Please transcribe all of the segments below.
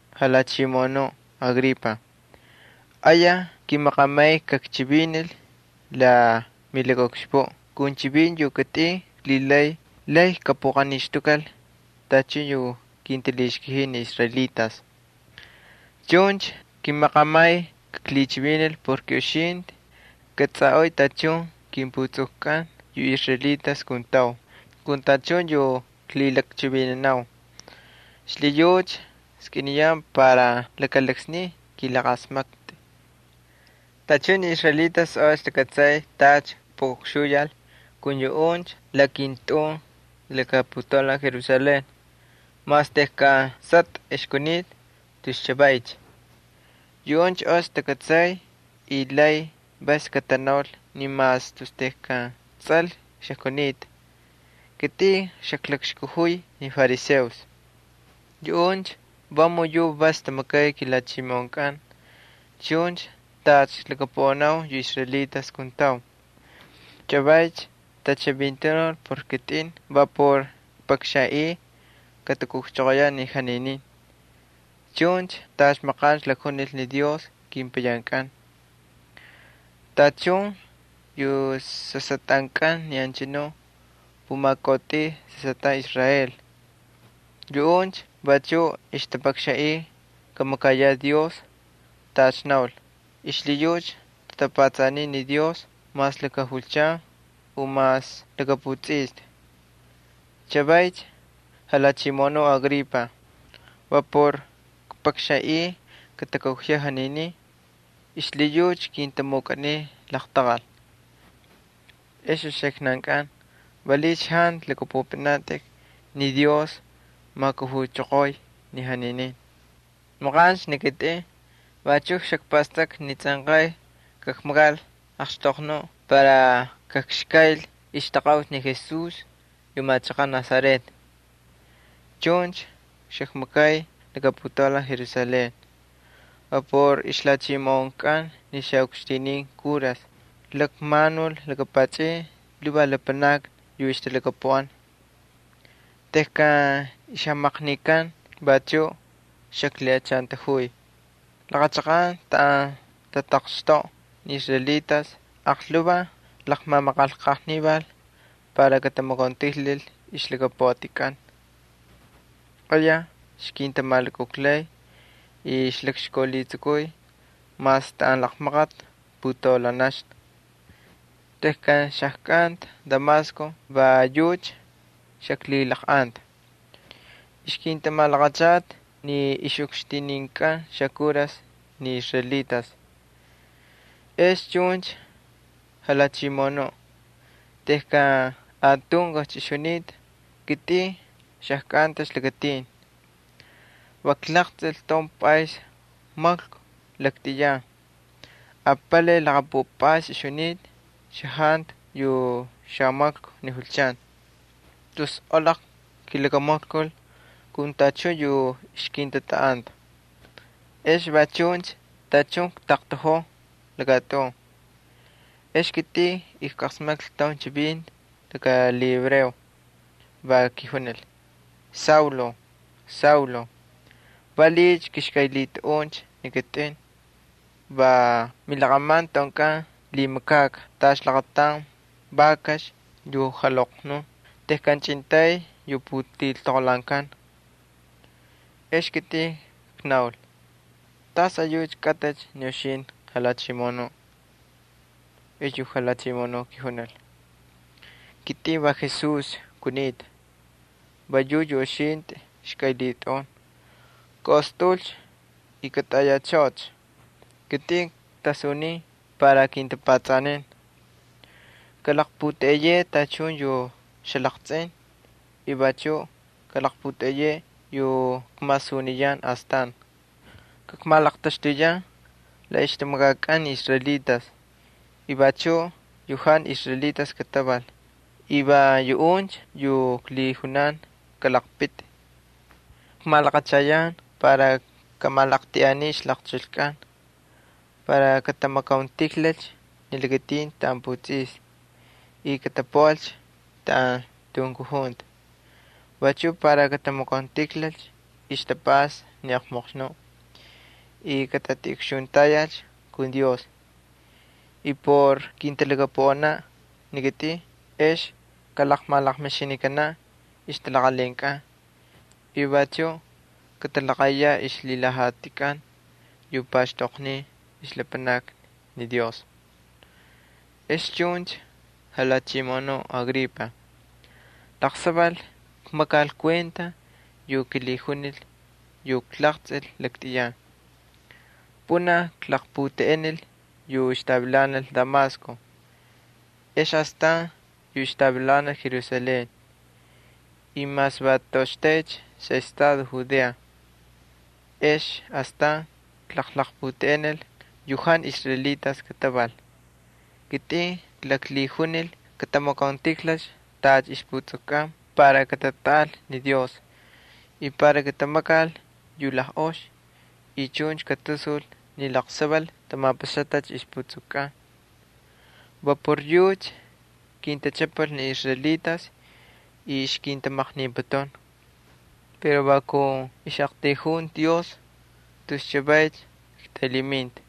—Jalhachimoꞌonuꞌ Agripa, ayaj kimaqamay kakchivinil la milakaꞌukxpuꞌ kun chivinti yu kitꞌin klhilay lay kakpuꞌaqanixtukal tachun yu kintalhixkajiy ni israelitas. Chuncha kimaqamay kakchivinil porke uxintꞌi kꞌatsꞌaꞌoꞌoy tachun kinputsukkꞌan yu israelitas kuntau kun tachun yu klhilakchivinanau. Xlhiyucha kskꞌiniyan para laka laksniy kꞌiꞌalasmaktꞌi. ’Tachun ni israelitas ox takꞌatsay tacha kpuꞌukxuyal kun yuꞌuncha la kintꞌun laka putaulan Jerusalén, mas tejkan sꞌatꞌa xajkunita tus chavaycha. Yuꞌuncha ox takꞌatsay y lay vas katanaul ni mas tus tejkan tsꞌal xajkunita, kitꞌin xajkalakꞌakxkajuy ni fariseos. Yuꞌuncha vamun yuꞌ vas tamakay kilhachimoꞌonkꞌan chuncha tacha klhakapuꞌanau yu israelitas kuntau. Chavaycha tachivintanul por kitꞌin va por kpakxanꞌiy katakujchoqoyaꞌ ni janinin chuncha tacha maqancha jajunil ni Dios kepayankꞌan. Tachun yu sasꞌatꞌankꞌan ni anchanu pumakautꞌuy sasꞌatꞌan Israel, yuꞌuncha vachuꞌ ixtapakxanꞌiy kamakayaꞌ Dios tacha naul y xlhiyucha tatapatsaniy ni Dios mas laka julchan u mas laka putsꞌista. Chavaycha, jalhachimoꞌonuꞌ Agripa, va por kpakxanꞌiy katakujaꞌ janinin, xlhiyucha kintamukꞌaniy laqtaqal. ¿Ex uxiknankꞌan valiꞌiycha jantu lhakꞌapꞌupꞌinatꞌik ni Dios majkujuchoqoy ni janinin? ’Maqancha ni kitꞌin vachuꞌ xakpastakꞌa ni tsꞌanqay kakmakal axtoqnuꞌ para kakxkayl ixtaqaꞌuti ni Jesús yu machaqaꞌ Nazaret. Chuncha xakmakay laka putaulan Jerusalén. Va por ixlhachimoꞌonkꞌan ni xaꞌukxtinin kuras klakmanul laka pachꞌin lhuvaj lapanakni yu ixtalhakapuꞌan. Tejkan ixjamaqnikan vachuꞌ xaklhiꞌachantajuy. Laqa chaqan taꞌan tataqxtoꞌa ni israelitas aqlhuvaj klaqmamaqanlqajnival para katamakauntijlal ixlhakapuꞌatkꞌan. Ayaj ixkintamalukujlay y xaklakxkaulhitsukuy mas taꞌan laqmaqati putaulanaxna. ’Tejkan xajkꞌanta Damasco va yucha xaklhilaqꞌanta. Ixkintamalaqachata ni ixꞌukxtininkꞌan xakuras ni israelitas. Ex chuncha, jalhachimoꞌonuꞌ, tejkan atunkujcha ixjunita, kitꞌin xajkꞌantacha lakatin. Va klaqtsꞌil taun pꞌays maklku laktꞌiyan apalay laqpupꞌays ixjunita xajantu yu xamaklku ni julchan. Tus olaql kilakamaklkul kun tachun yu ixkintatꞌaꞌanta. Ex va chuncha tachun ktaqtaꞌojoo lakatꞌun, ex kitꞌin ijqasmaklhi taun chivinti laka lhihebreo, va kijunil: “Saulo, Saulo, ¿valiꞌiycha kꞌixkꞌaylhitꞌaꞌuncha ni kitꞌin? Va milaqꞌaman tꞌaunkꞌan lhimakꞌakꞌa tacha laqataun vakax yu jalhoqnun tejkan chꞌintay yu putiltoqolhaankan.” Ex ni kitꞌin knaul: “¿Tas ayucha kꞌatꞌicha ni uxintꞌi, Jalhachimoꞌonuꞌ?” ’Ex yu Jalhachimoꞌonuꞌ kijunil: “Kitꞌin va Jesús kunita, va yucha yu uxintꞌi xkꞌaylhitꞌaꞌun. Kaꞌostꞌaꞌulcha y katꞌayachꞌoꞌocha. Ni kitꞌin ktasunin para kintꞌapꞌatsꞌanin. Kꞌalaqpꞌutꞌeꞌeyeꞌe tachun yu xalaqtsꞌin y vachuꞌ kꞌalaqpꞌutꞌeꞌeyeꞌe yu kmasuniyan astan. Kakmalaqtaxtuyan la ixtamakakꞌan ni israelitas y vachuꞌ yu jantu israelitas kataval y va yuꞌuncha yu klhijunan kaalaqpiti. Kmalaqachayan para kꞌamalaqltꞌiꞌanin ixlaqchulkꞌan, para katamakauntijlalcha ni lakatin taꞌan putsꞌista y katapuꞌalcha taꞌan tunkujunta. Vachuꞌ para katamakauntijlalcha ixtapꞌasta ni Satanás y katatiꞌukxuntayal kun Dios. Y por kintalhakapuꞌanaꞌ ni kitꞌin ex kalaqmalaqmixinikanaꞌ ixtalaqalhinkꞌan y vachuꞌ katalaqaꞌiyaꞌ ixlhilhajatikꞌan yu paxtoqniy ixlapanakni Dios.” ’Ex chuncha, jalhachimoꞌonuꞌ Agripa, laqsaval kmakal kuenta yu kilhijunil yu klaqtsꞌil laktꞌiyan. Pꞌunaj klaqlaqputeꞌenil yu ixtavilanal Damasco, ex astan yu ixtavilanal Jerusalén y mas va toꞌoxtaycha xaꞌestado Judea, ex astan klaqlaqputeꞌenil yu jantu israelitas kataval. Kitꞌin klaklhijunil ni katamapaxal ixjatapastakꞌatkꞌan para katatꞌaꞌal ni Dios. Iknaul ni katamakal yu lajꞌox ex katasul ni laqsaval tamapaxatacha ixjatapastakꞌatkꞌan. Va por yucha kintachꞌapal ni israelitas laka ay lakatajtan y ixkintalhimaqniputun. Pero va kun ixꞌaqtayjunti Dios tus chavaycha ktaylhiminta.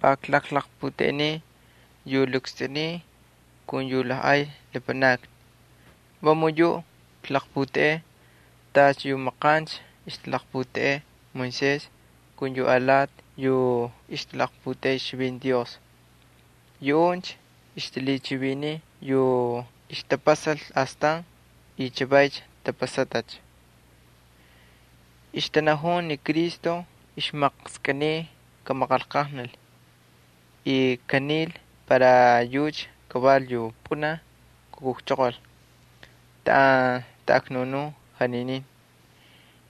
Va klaqlaqputeꞌeniy yu lakstꞌuniy kun yu lajꞌay lapanakni. Vamun yuꞌ klaqputeꞌey tacha yu maqancha ixtalaqputeꞌey Moisés ali yu alati yu ixtalaqputeꞌey ixchivinti Dios. Yuꞌuncha ixtalhichiviniy yu ixtapasal astan y chavay tapasatacha. Ixtanajun ni Cristo ixmaqskꞌiniy kamaqanlqajnal y kanil para yucha kaval yu pꞌunaj kujchoqol taꞌan taꞌaknunun janinin,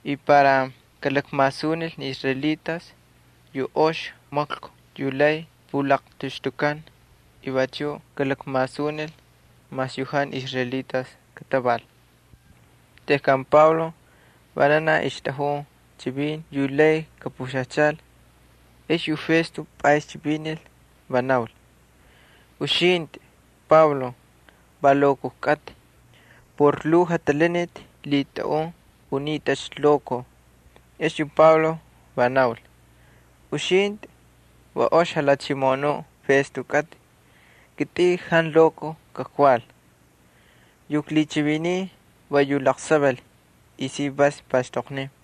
y para kalakmasunil ni israelitas yu ox maklku yu lay pulaqtaxtukan y vachuꞌ kalakmasunil mas yu jantu israelitas kataval. Tejkan Pablo vananaj ixtꞌajun chivin yu lay kapuxajchal, ex yu Festo pꞌays chivinil, va naul: —Uxintꞌi, Pablo, va lokoj kꞌatꞌi. Por lhuu jatalaniti lhitꞌaꞌun, unitꞌacha lokoj. Ex yu Pablo va naul: —Uxintꞌi, yu ox jalhachimoꞌonuꞌ Festo kꞌatꞌi, kitꞌin jantu lokoj kakval. Yu klhichiviniy va yu laqsaval y si vas paxtoqniy.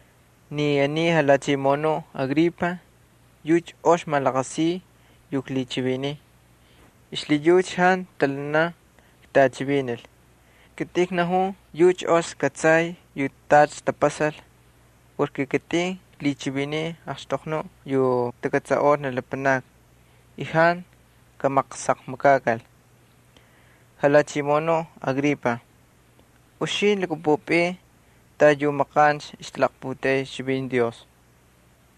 Ni aniy jalhachimoꞌonuꞌ Agripa yucha ox malaqasiy yu klhichiviniy. Xlhiyucha jantu ktalhanan ktꞌachivinil. Kitꞌin knajun yucha ox kꞌatsay yu tacha tapasal porke kitꞌin klhichiviniy axtoqnuꞌ yu takꞌatsaꞌol ni lapanakni y jantu kamaqsaqmakakal. Jalhachimoꞌonuꞌ Agripa, ¿Uxintꞌi lhakꞌapꞌupꞌin tacha ixtanajun yu maqancha ixtalaqputeꞌey ixchivinti Dios?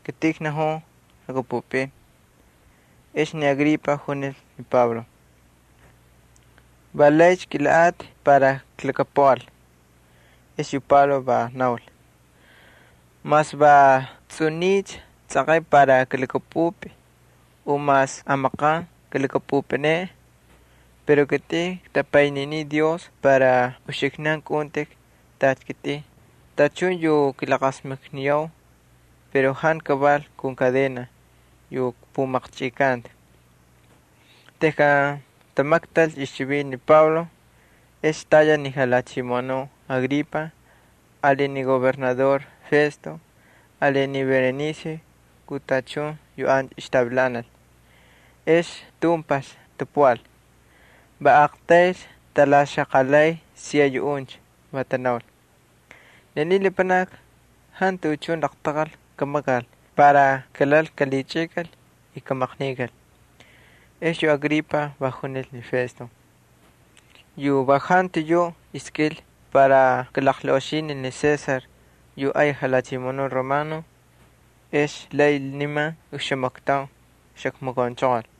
Kitꞌin knajun lhakꞌapꞌupꞌin. Ex ni Agripa junil ni Pablo: —Va laycha kꞌilhaꞌatꞌi para kaklhakapuꞌal. Ex yu Pablo va naul: —Mas va tsꞌuniycha tsꞌanqay para kalhakꞌapꞌupꞌi u mas amaqan kalhakꞌapꞌupꞌineꞌe, pero kitꞌin ktapayniniy Dios para kꞌaꞌuntꞌik tacha kitꞌin tachun ni uxiknan yu kilaqasmakniyau, pero jantu kaval kun kadena yu kpumaqchꞌikanta. Tejkan tamaktalcha ixchivinti ni Pablo, ex tayal ni jalhachimoꞌonuꞌ Agripa ali ni gobernador Festo ali ni Berenice kun tachun yu ancha ixtavilanal. Ex tumpajcha tapuꞌal, va aqtaylcha talaxaqalay siya yuꞌuncha, va tanaul: —Ni aniy lapanaki jantu tuꞌuchun laqtaqal kamakal para kalal kalhichꞌikal y kamaqnikal. Ex yu Agripa va junil ni Festo: —Incha jantu iskꞌil para kalaqlaꞌoxinil ni César yu ay jalhachimoꞌonuꞌ romano, ex lay niman oxamaktaun xakmakaunchoqol.